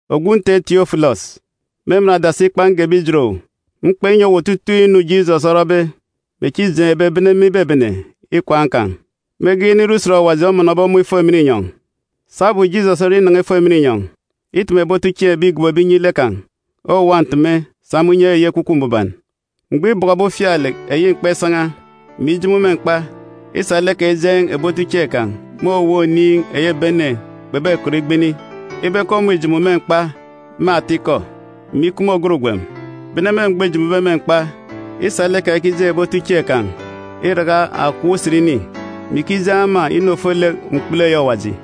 Ogwu nte Tiofilọs, me emen adasi ikpa ngebe ijet owu, mkpa inyi owu otutuuk inu Jisọs orọbe, mè echi îjeen̄be bene me ibebene ikwaan̄ kan̄, mege inire usen Awaji omọnọbe ọmọ ifo emen inyọn̄. Sabum Jisọs oninan̄a ifo emen inyọn̄, îteme ebi otuchieen̄ ebi îgobobe inyi lek kan̄ owuwa nteme sa me unye eyi Ekwukwu Mbuban. Mgbọ îbọkọbe ufialek eyi mkpa isan̄a, mè ijomo me mkpa, îsa lek kan̄ ijeen̄ ebi otuchieen̄ kan̄ me owuwa oniin̄ eyi ebi ene kpebekọt igbini, ibe ke ọmọ îjomo me mkpa me atikọ, mè ikup me ògat ugwem. Bene me mgbọ îjomobe me mkpa, îsa lek kan̄ ikijeen̄ ebi otuchieen̄ kan̄ iraka akọp usen ini, mè ikijeen̄ ema inu ofolek mkpulu eyi Awaji.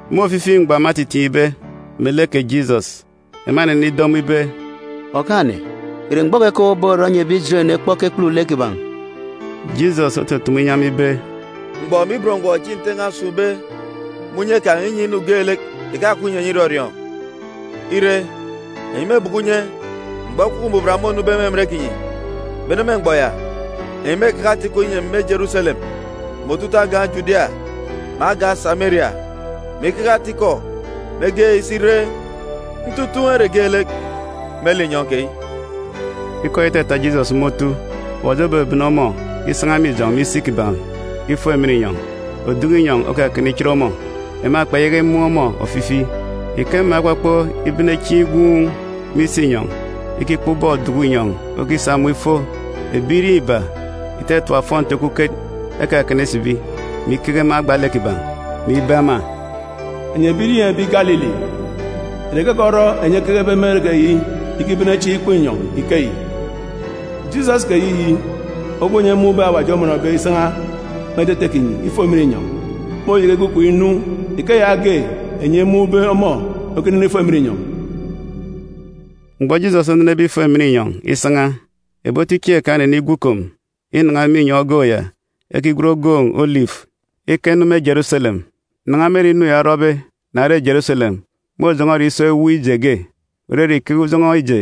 Me ofifi mgbọ ema etitiin̄be melek kè Jisọs, ema enenido ọmọ ibe, “Okaan̄-ene, ìre mgbọ keyi ke owu oborọ inyi ebi Ijeren ekpọk ekekpulu lek kiban̄?” Jisọs otutumu inyi ema ibe, “Mgbọ mè ibot mgbọ echi Nte n̄a osun̄be me unye kan̄ inyi inu geelek ìkakup ìnyi enyi irọriọọn̄. Ire, enyi mêbọkọ unye mgbọ Ekwukwu Mbuban mônube me emen kinyi. Bene me mgbọ ya, enyi mêkeke ata-ikọ inyi emi me Jeruselem, mè otutuuk agan̄ Judia, mè agan̄ Sameria, mè ikeke ata-ikọ mege isi ire ntutun̄ ere geelek me linyọn̄ keyi.” Ikọ ya itata Jisọs me otu, Awaji obebene ọmọ isan̄a me ijọn̄ me isi kiban̄ ifo emen inyọn̄. Oduku inyọn̄ okakana ichit ọmọ. Ema kpeyaka imun̄ ọmọ ofifi. Ike ema ekpọkpọ ibene chieen̄ igwuun̄ me isinyọn̄ ikikpọ ubọk oduku inyọn̄ okisa ọmọ ifo, ebirieen̄ iba ìtatap ofọnti okuket ekakana isibi, mè ikeke me agba lek kiban̄, mè ibe ema, “Enyi ebirieen̄ ebi Galili, ìre keke orọ enyi ekekebe me ere keyi ikibene chieen̄ ikpọ inyọn̄ ikeyi? Jisọs keyiyi ogwu enyi emun̄be Awaji omọnọbe isan̄a me etete kinyi ifo emen inyọn̄, môyaka igwu ikom inu ike yaage enyi emun̄be ọmọ okinene ifo emen inyọn̄.” Mgbọ Jisọs onenebe ifo emen inyọn̄ isan̄a, ebi otuchieen̄ kan̄ enenigwu ikom inan̄a me inyọn̄ ogoon̄ ya ekigwen ogoon̄ Olifu ika inu me Jeruselem. Nan̄a me ere inu ya orọbe na re Jeruselem môjọn̄ọ ere iso ewuuk ije ge, òrere ikeke ujọn̄ọ ije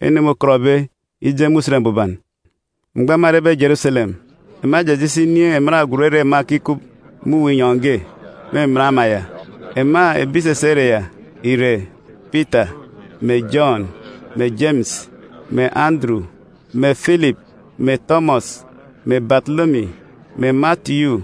ene môkọtbe ije me Usen Mbuban. Mgbọ ema erebe Jeruselem, ema ejeje isi inin̄ emen agwut ere ema ekikup me uwu inyọn̄ ge me emen ama ya. Ema ebi ìsisi ere ya ìre: Pita, mè Jọn, mè Jemis, mè Anduru, mè Filip, mè Tọmọs, mè Batolomi, mè Matiyu,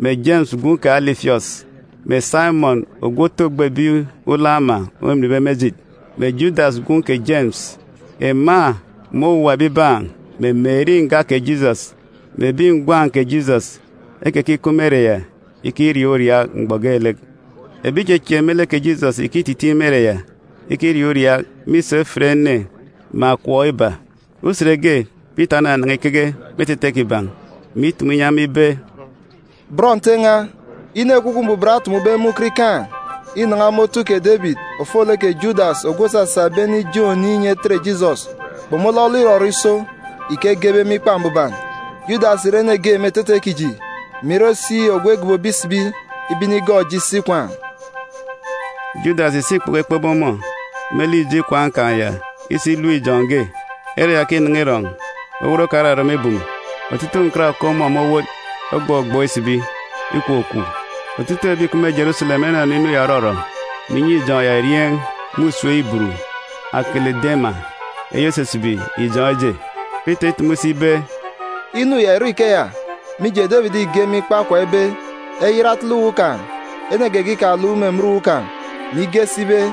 mè Jemis gwun̄ kè Alifiọs, mè Saimọn ogwu otu ogbo ebi ulọk ama ominbe me ejit, mè Judas gwun̄ kè Jemis. Ema mè owuwa ebibaan̄, mè Meri nga kè Jisọs, mè ebi ngwan̄ kè Jisọs, ekekikup me ere ya ikiriaak uriaak mgbọ geelek. Ebi ìchieek me lek kè Jisọs ìkititiin̄ me ere ya ikiriaak uriaak mîso efit ene me akọp iba. Usen ge, Pita onanan̄a ikeke me etete kiban̄, mè itumu inyi ema ibe, “Bọn Nte n̄a, inu Ekwukwu Mbuban otumube me ukot ikaan̄ inan̄a me otu kè Debit ofolek kè Judas ogwu òsasa ebi ene ijeen̄ oniin̄ inyi enetet Jisọs kpomolọlọ irọrọ iso ike egebe me Ikpa Mbuban. Judas ìre ene ge me etete kiji, mè ire si ogwu egogobo isibi ibe inigọọk eji isi ikwaan̄.” Judas îsa ikpoko ekpebe ọmọ me lek ijo ikwaan̄ kan̄ ya isi ilep ijọn̄ ge. Ere ya ke înan̄a irọn̄, owot kan̄ orarama ibum, otutuuk nkat òkup ọmọ me owot ogbọgbọọk isibi, ikwukwu. Otutuuk ebi ìkup me Jeruselem enọnọ inu ya òrọrọ, mè inyi ijọn̄ ya erieen̄ me usem Iburu, Akelidama (eyi òsisibi Ijọn̄ Eje). Pita îtumu si ibe, “Inu ya ìrọ ikeya, mije, Debit ìge me Ikpa Okwa ibe: “ ‘Eyat etele uwu kan̄, ene geege ikaluk me emen uwu kan̄,’a mè ige si ibe,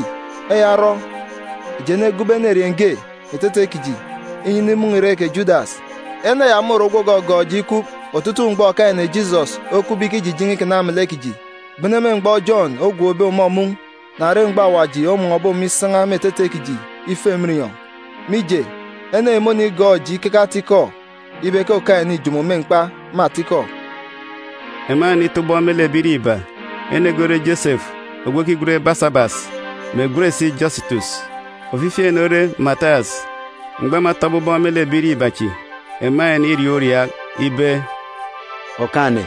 “Eya orọ, eji enegobo enerieen̄ ge me etete kiji, inyi inimọnọ irek kè Judas. Ene ya môre ogwu ògọgọọk eji ikup otutuuk mgbọ Okaan̄-ene Jisọs okupbe ikijijen̄e ikana melek kiji, bene me mgbọ Jọn ogwookbe ọmọ mun̄ na re mgbọ Awaji omọnọbe ọmọ isan̄a me etete kiji ifo emen inyọn̄. Mije, ene yi mônigọọk eji ikeke ata-ikọ ibe ke Okaan̄-ene îjomo me mkpa me atikọ.” Ema enenitọ ubọk me lek ebirieen̄ iba. Ene ge ore Josefu ogwu ekigwen Basabas, (mè ègwen si Jọsitọs). Ofifi ene ore Matiyas. Mgbọ ema etọbe ubọk me lek ebirieen̄ iba chi, ema eneniriaak uriaak ibe, “Okaan̄-ene,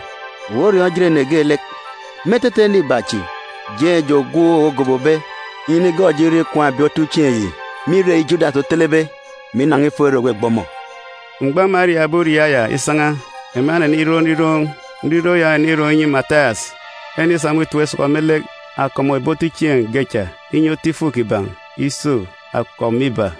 owu oriọọn̄ ejit ene geelek. Me etete ene iba chi, jeen̄ eji ogwu owu ogobobe, inyi inigọọk eji irọ ikwaan̄ ebi otuchieen̄ yi me irek eyi Judas otelebe, mè inan̄a ifo ere ògbegbe ọmọ.” Mgbọ ema eriaakbe uriaak ya isan̄a, ema eneniroon̄ nriroon̄. Nriroon̄ ya onenirọn̄ inyi Matiyas. Enenisa ọmọ itap isọkọ me lek akọp mè ebi otuchieen̄ ge cha, inyi otu ifuk kiban̄ iso akọp mè iba.